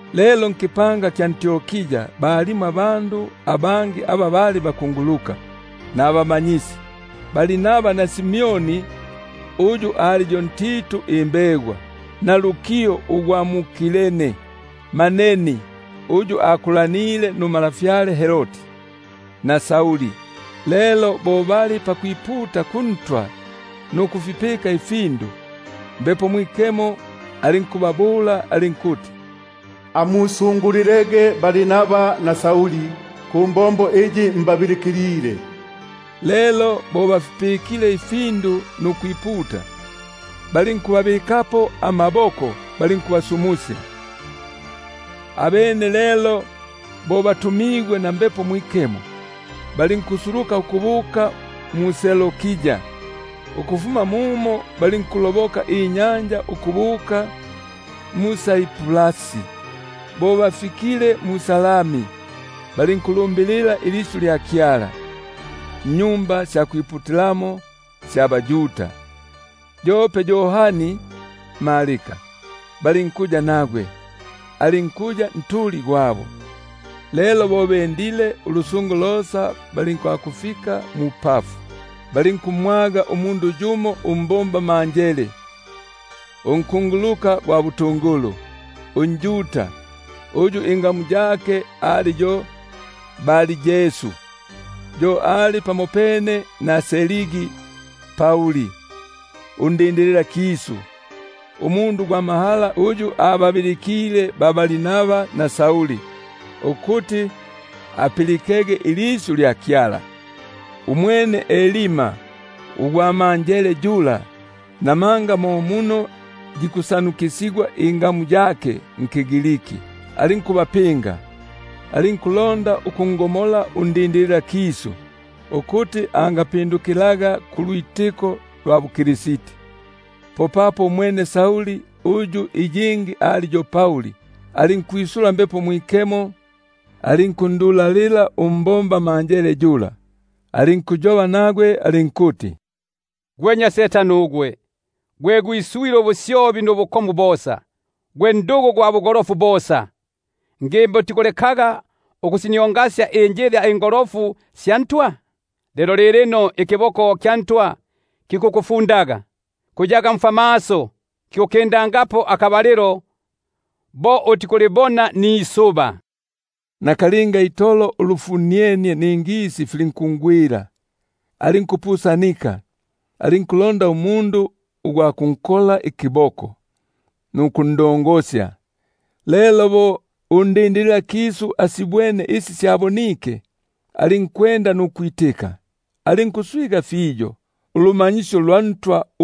Lelo nkipanga iki kyali mwʼAntiokia, mo balimo abakunguluka nabamanyisi, Barnaba na Simeoni uyu batigi Nigeri, na Luki ugwa mu-Kirene, na Manaeni, uyu akulile pamopene nuntwa Herodi, na Sauli. Lelo bo bali pakwiputa kuNtwa nukufipika ifindu, Mbepo Mwikemo alinkubabula alinkuti: Amusungulilege Barnaba na Sauli kumbombo iyi mbabilikilile. Lelo bo bafipikile ifindu nukwiputa, balinkubabikapo amaboko, balinkubasumusya. Abene lelo bo batumigwe na Mbepo Mwikemo, balinkusuluka ukubuka mu-Seloikia, ukufuma mumo balinkuloboka inyanja ukubuka mu-Saiprasi. Bo bafikile mu-Salami, balinkulumbilila ilisyu lya Kyala mmaSinagogi ga baYuda; yope Yohani balinkuya nagwe, alinkuya ntuli gwabo. Lelo bo bapulungenie ulusungo losa bayilekufika mu-Pafu, balinkumwaga umundu yumo umbombamanjele, unkunguluka gwa butungulu, unjuda, uyu ingamu yake ali yo Bar-Yesu; yo ali pamopene na Sergi Pauli, undindililakisu, umundu gwa mahala uyu ababilikile ba-Barnaba na Sauli, ukuti apilike ilisyu lya Kyala. Umwene Elima ugwa manjele yula (namanga mo muno yikusanukisigwa ingamu yake) alinkubapinga, alinkulonda ukungomola undindililakisu ukuti angalukongaga ulwitiko lula. Umwene Sauli uyu iyingi ali yo Pauli, alinkwi- sula Mbepo Mwikemo alinkundulalila, alinkuyoba nagwe alinkuti: Gwe nnya mohesi ugwe, gwe gwiswile ubusyobi nubukomu bosa, gwe ndugu gwa bugolofu bosa; ngimba utikulekaga ukusiniongasya injila ingolofu sya Ntwa? Lelo keta, ikiboko kya Ntwa kili pamyako, kuyaga mfwamaso, kikukindangapo akabalilo bo utikulibona nisuba. Nakalinga itolo ulufunienie ningisi filinkungwila, alinkupusanika, alinku- londa umundu gwa kunkola ikiboko nukundongosya. Lelo bo undindililakisu asibwene isi syabonike, alinkwenda nukwitika, alinkuswiganika nulumanyisyo lwa Ntwa.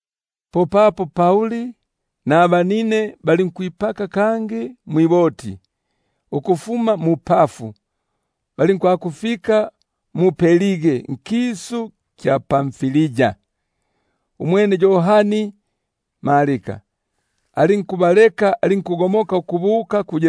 Popapo Pauli nabanine balinkwipaka kangi mwiboti ukufuma mu-Pafu, balinkwakufika mu-Perge nkisu kya Pamfilia. Umwene Yohani alinkubaleka, alinkugomoka ukubuka ku-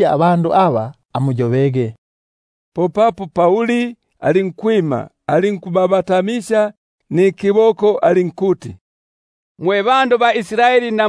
abandu aba, amuyobege. Popapo Pauli alinkwima, alinkubabatamisya nikiboko alinkuti: Mwe banyambala ba Israeli na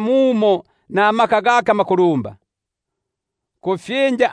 mumo nikiboko ikinuligwa. Alinkuti lya mbepa kufyinja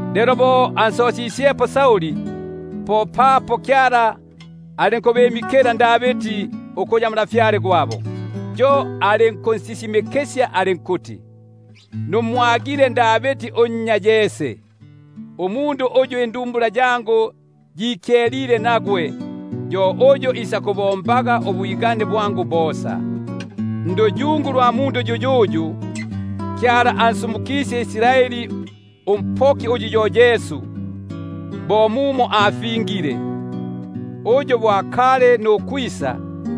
Lelo bo ansosisyepo, popapo alinkubimikila Davidi ukuya ntwa gwabo; yo alinkunsisimikisya alinkuti: Numwagile Davidi unnya Yese, umundu uyu indumbula yangu yikyelile nagwe, yo uyu isakubombaga ubwigane bwangu bosa. Nduyungu lwa mundu yuyuyu, Kyala, ansumukisye Israeli umpoki, yu Yesu, bo mumo afingile; uyu bo akali nukwisa,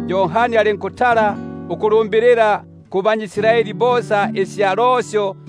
Yohani alinkutala ukulumbilila kubanyʼIsraeli bosa isya losyo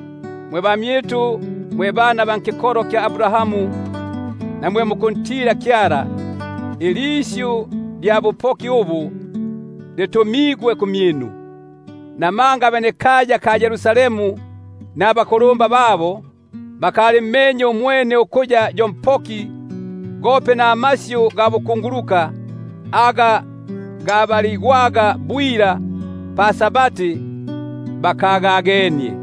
Mwe bamyitu, mwe bana ba kikolo kya Abrahamu na mwe mukuntila Kyala, ilisyu lya bupoki ubu, litumigwe kumyitu. Namanga aba bayengile mu-Yerusalemu nabakulumba babo, papo bakalimmenye yuyo, kangi bakagamenye amasyu ga bakunguluka aga gabaligwaga bwila pa-Sabati, balinkusima-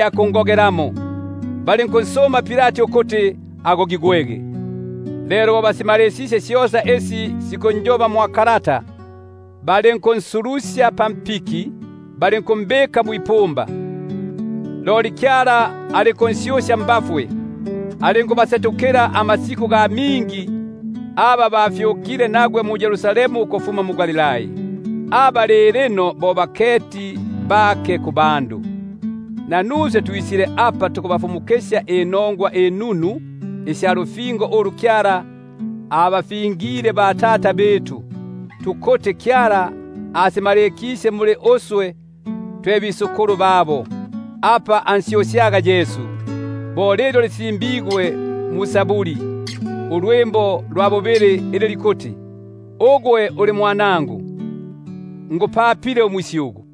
kungogelamo, balinkunsuma Pilati ukuti agogigwe. Lelo bo basimalisisye syosa isi sinkunjoba mwa kalata, balinkunsulusya pampiki, balinkumbika mwipumba. Loli Kyala alinkun- syusya mbafwe; alinkubasetukila amasiku ga mingi aba bafyukile nagwe mu-Yerusalemu ukufuma mu-Galilai, aba lilino bo baketi bake kubandu. Nanuswe tukubafumukisya inongwa inunu isya lufingo ulu bapegigwe batata, ukuti Kyala asimalikisye muli uswe twe banabo, apa ansyusyaga Yesu, bo lilyo lisimbigwe ndwimbo lwa Israeli ulwa bubili ili likuti: Ugwe uli Mwanangu, ngupapile umusyugu.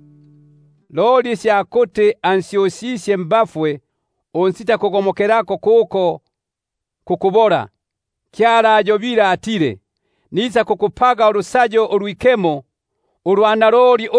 Loli isya kuti ansyusisye mbafwe, unsitakugomokelako kububofu, syo asiyobile atile: Nisakubapaga ulusayo ulwikemo, ulwa naloli,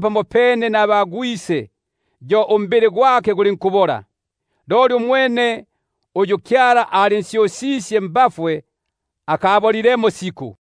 pamopene nabagwise, alinkukumanya ukubola. Loli umwene uyu Kyala alinsyusisye, yo akakumanyamo ukubola.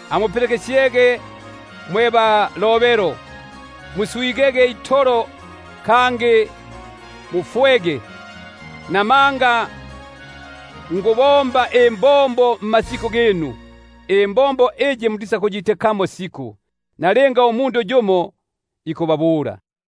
Amuketege mwe basyokeli, muswigege, kangi muyongege; Buno nikubomba imbombo mmasiku ginu, Imbombo iyi mutisakuyitikamo siku, linga yumo ikubabula.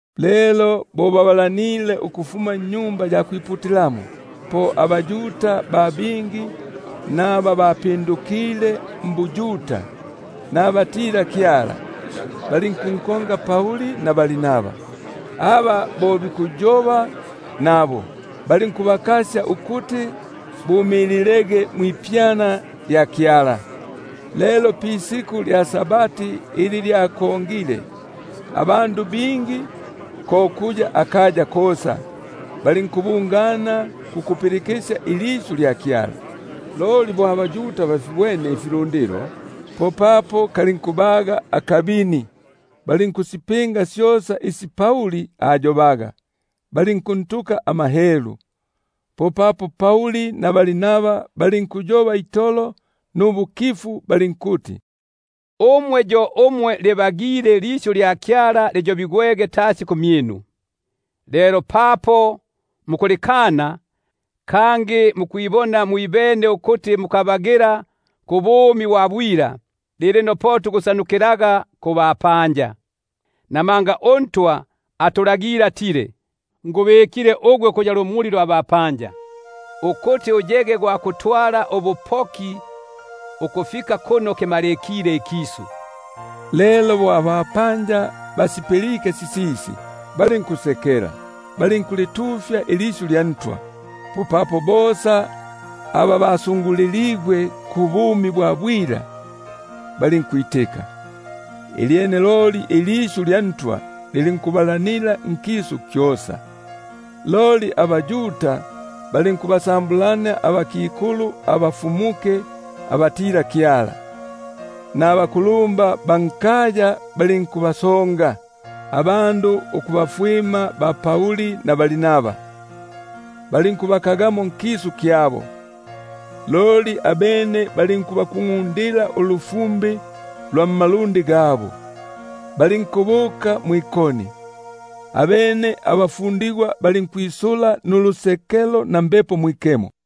Lelo bo babalanile ukufuma mu-Sinagogi, po abaYuda ba bingi nabingisigwa mbuYuda, abatila-Kyala, balinkunkonga Pauli na Barnaba, aba bo bikuyoba nabo, balinkubakasya ukuti bumililege mwipyana lya Kyala. Lelo pa-Sabati ugwa bubili, abandu ba bingi, ko kuya akaya kosa, balinkubungana kukulipilikisya ilisyu lya Kyala. Loli bo abaYuda balibwene ifilundilo, popapo kalinkubaga akabini, balinkusipinga syosa isi Pauli ayobaga, balinkunhelula. Popapo Pauli na Barnaba balinkuyoba itolo nubukifu balinkuti: Kwabagile ukuti ilisyu lya Kyala Uyobigwege tasi kumyinu; lelo papo mukulikana, kangi mukwibona mwibene ukuti mukabagila kubumi bwa bwila, keta, lilino po tukusanu- kilaga kubapanja. Buno mo mumo atulagile uNtwa ukuti: Ngubikile ugwe ukuya lumuli lwa bapanja, Ukuti uyege gwa kutwala ubupoki, ukufika kuno kimalikile ikisu. Lelo bo abapanja basipilike sisisi, balinkusekela balinkulitufya ilisyu lya Ntwa. Popapo bosa aba balyimikiligwe kubumi bwa bwila balinkwitika. Ilyene ilisyu lya Ntwa lilinkubalanila nkisu kyosa. Loli abaYuda balinkubasambulania abakikulu abafumuke abatila-Kyala, nabakulumba ba kaya, balinkubasonga abandu ukubafwima ba-Pauli na Barnaba, balinkubaka- gamo nkisu kyabo. Loli abene balinkubakungʼundila ulu- fumbi lwa kumalundi gabo, balinkubuka mwʼIkoni. Abene abafundigwa balinkwisula nulusekelo na Mbepo Mwikemo.